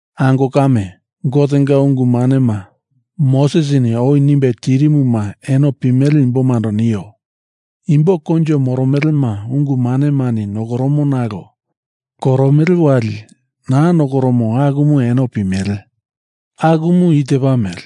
Ango kame, Gotenga ungu manema Mosesini oi nimbe tirimuma eno pimele imbomando nio. Imbo koinjo moromelema ungu manemani nokoromo nalo koromele wali naa nokoromo akumu eno pimele. Akumu i tepa mele: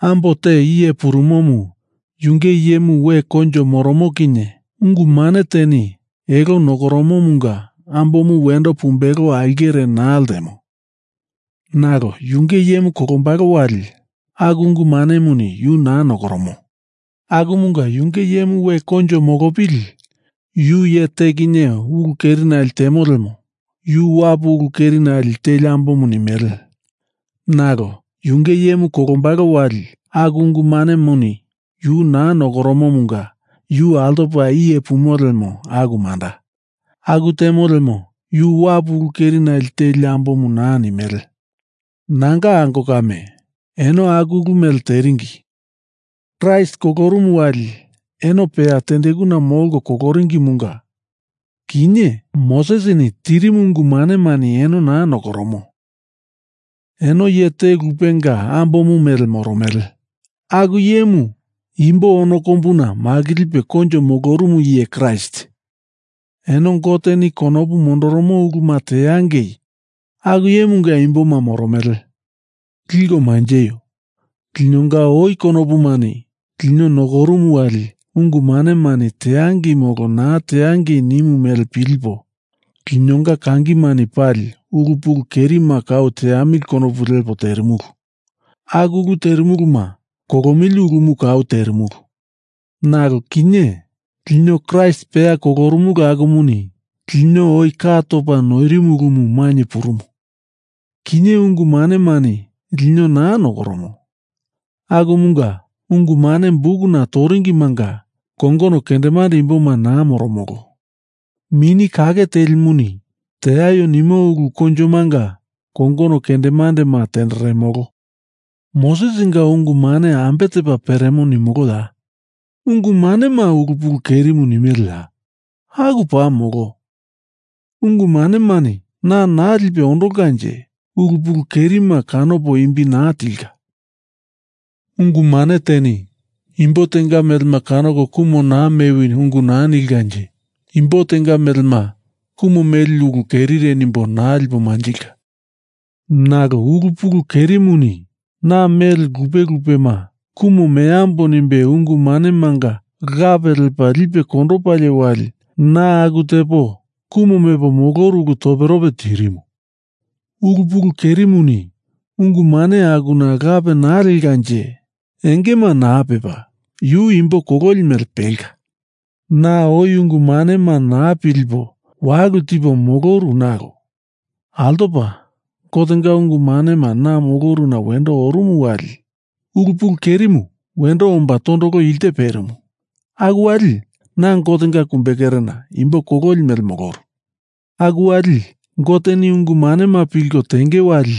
Ambo te iye purumomu yunge iyemu we koinjo moromo kinye ungu mane teni elo nokoromomunga ambomu wendo pumbelo aulkere naa ltemo. Nalo yunge iyemu kolombalo wali aku ungu manemuni yu naa nokoromo. Akumunga yunge iyemu we koinjo molopili yu iye te kinye ulu kerinale temo lemo yu wapu ulu kerinale teli ambomu nimele. Nalo yunge iyemu kolombalo wali aku ungu manemuni yu naa nokoromomunga yu altopa iye pumo lemo aku manda. Aku temo lemo yu wapu ulu kerinale teli ambomu naa nimele. Nanga ango kame, eno aku ulu mele teringi. Kraist kolorumu wali eno peya tendekuna molko koloringimunga kinye Mosesini tirimu ungu manemani eno naa nokoromo, eno iye te lupenga ambomu mele moromele, aku iyemu imbo ono kombuna makilipe koinjo molorumu iye Kraist. Eno Goteni konopu mondoromo uluma teangei aku iyemunga imboma moromele. Liko manjeio. Linonga oi konopumani lino nokorumu wali ungu manemani teangei molo naa teangei nimu mele pilipo linonga kangimani pali ulu pulu kerima kau teamili konopu lepo terimulu. Aku ulu terimuluma kolomili ulumu kau terimulu. Nalo kinye lino Kraist peya kolorumulu akumuni lino oi ka topa noirimu ulumu mainye purumu. Kinye ungu manemani lino naa nokoromo. Akumunga ungu mane bukuna toringimanga kongono kendemande imboma naa moromolo. Mini Kake Telimuni teaio nimo ulu koinjomanga kongono kendemandema tenderemolo. Mosesinga ungu mane ambe tepa peremo nimoloya? Ungu manema ulu pulu kerimu nemiliya? Aku paa molo. Ungu manemani na naa lipe ondolkanje ulu pulu kerima kanopo imbi naa tilka. Ungu mane teni imbo tenga melema kanoko kumu naa mewi ungu naa nilkanje imbo tenga melema kumu meli ulu kerire nimbo naa lipo manjilka. Nalo ulu pulu kerimuni na mele lupe lupema kumu meambo nimbe ungu manemanga lape lepa lipe kondopalie wali na aku tepo kumu mepo moloru ulu toperope tirimu. Ulu pulu kerimuni ungu mane akuna lape naa lekanje engema naa pepa yu imbo kololi mele pelka. Na oi ungu manema naa pilipo walulu tipo moloru nalo altopa ungu manema na moloruna wendo orumu wali ulu pulu kerimu wendo omba tondolo ilte perimu, aku wali na Gotenga kumbekerena imbo kololi mele moloru. Aku wali Goteni ungu manema pilko tenge wali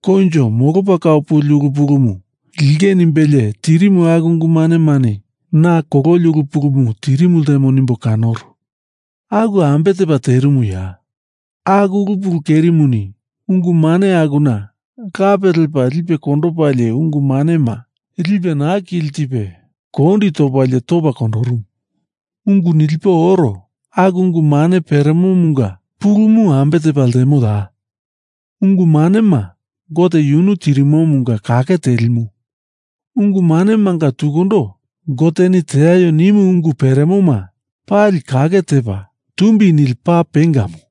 koinjo molopa kau puli ulu pulumu linge nimbelie tirimu aku ungu manemani na kololi ulu pulumu tirimu ltemo nimbo kanoru. Aku ambe tepa terimuya? Aku ulu pulu kerimuni ungu mane akuna lape lepa lipe kondopalie ungu manema lipe na kili tipe kondi topalie topa kondorumu. Ungu nilipo oro aku ungu mane peremomunga pulumu ambe tepa ltemoya? Ungu manema Gote yunu tirimomunga kake telimu. Ungu manemanga tukundo Goteni teaio nimu ungu peremoma pali kake tepa, tumbi nili paa pengamu.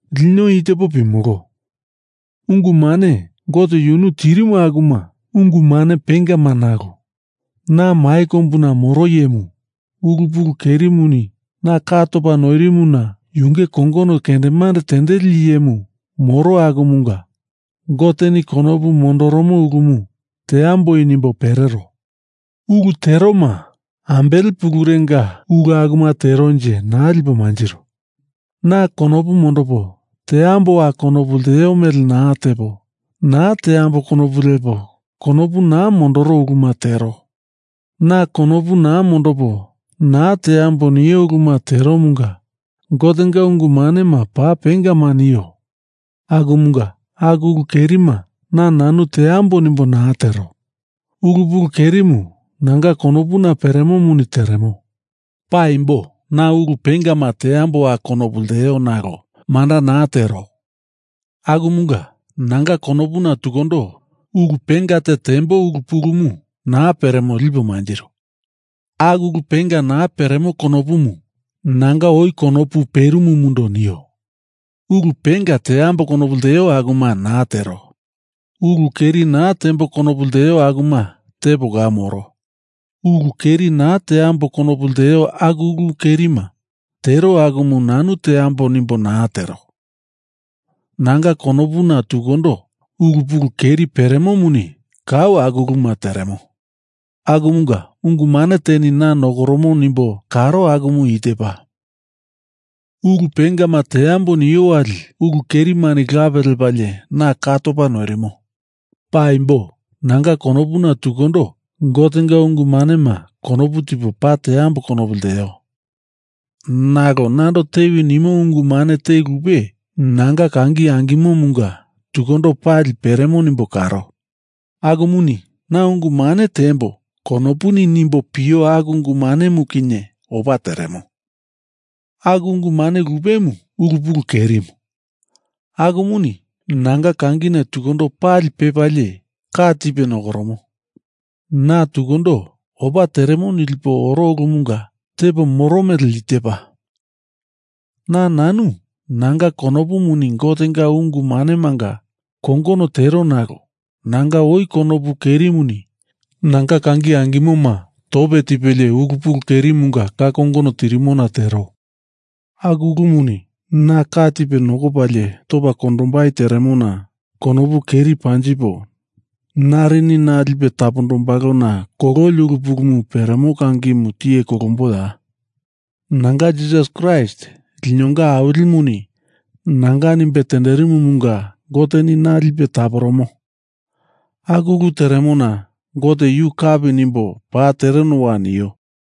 Lino i tepo pimolo: Ungu mane Gote yunu tirimu akuma ungu mane pengama nalo na mai kombuna moro iyemu ulu pulu kerimuni na ka topa noirimuna yunge kongono kendemande tendeli iyemu moro akumunga Goteni konopu mondoromo ulumu teamboi nimbo perero. Ulu teroma ambele pulurenga ulu akuma teronje, naa lipo manjiro. Na konopu mondopo teamboa konopu lteo mele naa tepo, naa teambo konopu lepo konopu naa mondoro uluma tero. Na konopu naa mondopo naa teambo nio uluma teromunga Gotenga ungu manema paa pengama nio. Akumunga aku ulu kerima na nanu teambo nimbo naa tero. Ulu pulu kerimu nanga konopuna peremomuni teremo. Paimbo na ulu pengama teamboa konopu lteo nalo manda naa tero. Akumunga, nanga konopuna tukundo ulu penga te tembo ulu pulumu naa peremo lipo manjiro. Aku ulu penga naa peremo konopumu nanga oi konopu perimumundo nio. Ulu penga teambo konopu lteo akuma naa tero. Ulu keri naa tembo konopu lteo akuma tepo kau moro. Ulu keri naa teambo konopu lteo aku ulu kerima tero akumu nanu teambo nimbo naa tero. Nanga konopuna tukundo ulu pulu keri peremomuni kau aku uluma teremo. Akumunga ungu mane teni na nokoromo nimbo kanoro akumu i tepa: Ulu pengama teambo nio wali ulu kerimuni lape lepalie na ka topa noirimo. Paimbo nanga konopuna tukundo Gotenga ungu manema konopu tipo paa teamboa konopu lteo, nalo nando tewi nimo ungu mane te lupe nanga kangi angimomunga tukundo pali peremo nimbo karo. Akumuni Na ungu mane teambo konopuni nimbo pio aku ungu manemu kinye opa teremo. Aku ungu mane lupemu ulu pulu kerimu, akumuni nanga kangina tukundo pali pepalie ka tipe nokoromo. Na tukundo opa teremo nilipo oro ulumunga tepo moro mele i tepa: Na nanu nanga konopumuni Gotenga ungu manemanga kongono tero nalo nanga oi konopu kerimuni nanga kangi angimoma tope tipelie ulu pulu kerimunga ka kongono tirimona tero. Aku ulumuni na ka tipe nokopalie topa kondombai teremona konopu keri panjipo narini na lipe tapombalona kololi ulu pulumu peremo kangimu tiye kolomboya? Nanga Jisas Kraist linonga Awilimuni nanga nimbe tenderimumunga Goteni na lipe taporomo. Aku ulu teremona Gote yu kapi nimbo paa terenowa nio.